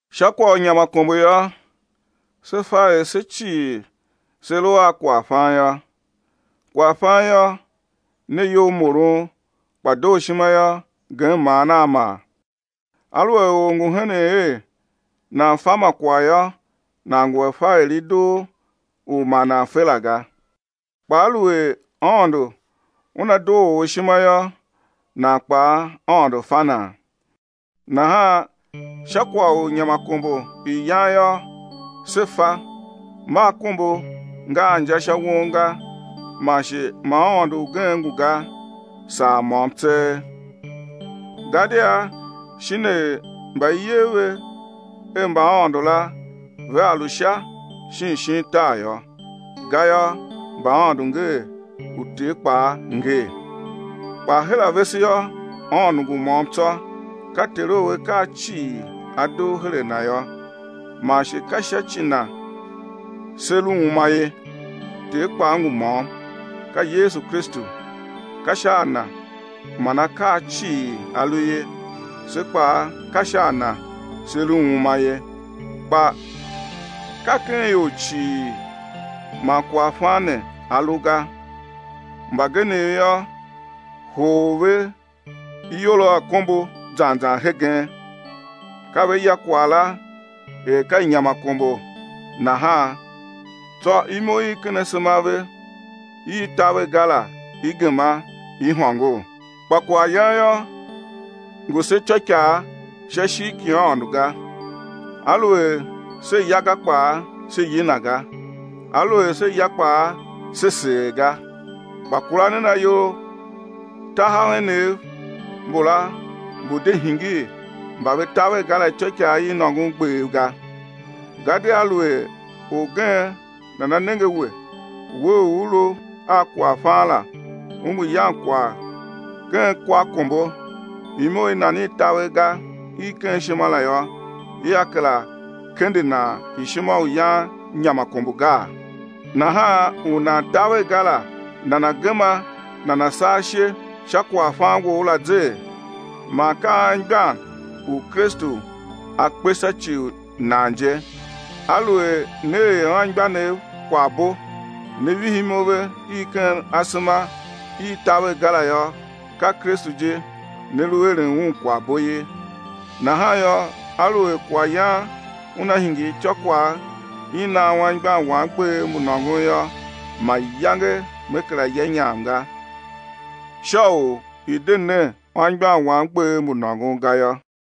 Sha kwagh u inyamakombo yô, se fa er se cii se lu a kwaghfan yô. Kwaghfan yô, ne iyolmoron kpa dooshima yô, gem maan a maa. Aluer or ngu henen er nan fa ma kwagh yô, nan ngu a fa er i doo u ma nan fe la ga. Kpa aluer Aôndo Una doo or ishima yô, nan kpaa Aôndo fa nan. Nahan sha kwagh u inyamakombo i yan yô, se fa, ma akombo nga a inja sha won ga, man shi ma Aôndo ugen ngu ga, saa môm tseegh. Gadia shin er mba i yer ve er mbaaôndo la vea lu Sha shin shin tar yô,—gayô mbaaôndo ngee uter kpaa ngee— kpa her a vese yô, Aôndo ngu môm tsô, ka Ter u akaa cii a dugh her a Na yô, man shi ka sha ci Na se lu uma ye; Ter kpaa ngu môm, ka Yesu Kristu, ka sha a Na man akaa cii a lu ye, se kpaa ka sha a Na se lu uma ye. Kpa ka ken ior cii man kwaghfan ne a lu ga. Mbagenev yô, hoghol ve iyol a akombo zan zan hegen, ka ve ya kwagh la er ka inyamakombo nahan; tsô imo i ken asema a ve i i taver ga la i gema i hôngor. Kpa kwaghyan yô, ngu se ityôikaa sha ishigh ki Aôndo ga. Aluer se ya ga kpaa, se yina ga, aluer se ya kpaa, se seer ga. Kpa kura nen ayol, tahav enev mbula mbu̱ de hingir mba ve taver ga la ityôikaa i nôngon gbev ga. Gadia aluer orgen nana nenge a we, we u u lu a kwaghfan la, u ngu yan kwagh ken kwa akombo, imo i nan i taver ga i ken ishima la yô, ia kera kende nan ishima u yan inyamakombo gaa? Nahan u nan taver ga la nana̱ gema nana̱ saa ishe sha kwaghfan wou la zee? Man ka anmgbian, u Kristu A kpe sha ci u nan je. Aluer ne er anmgbianev kwaghbo, ne vihi imo ve i ken asema i i taver ga la yô, ka Kristu je ne lu eren Un kwaghbo ye. Nahan yô, aluer kwaghyan una hingir ityôkwagh i nan anmgbian wam gbev mbu nôngon yô, mayange me kera ya inyam ga, sha u i̱ de ne anmgbian wam gbev mbu nôngon ga yô.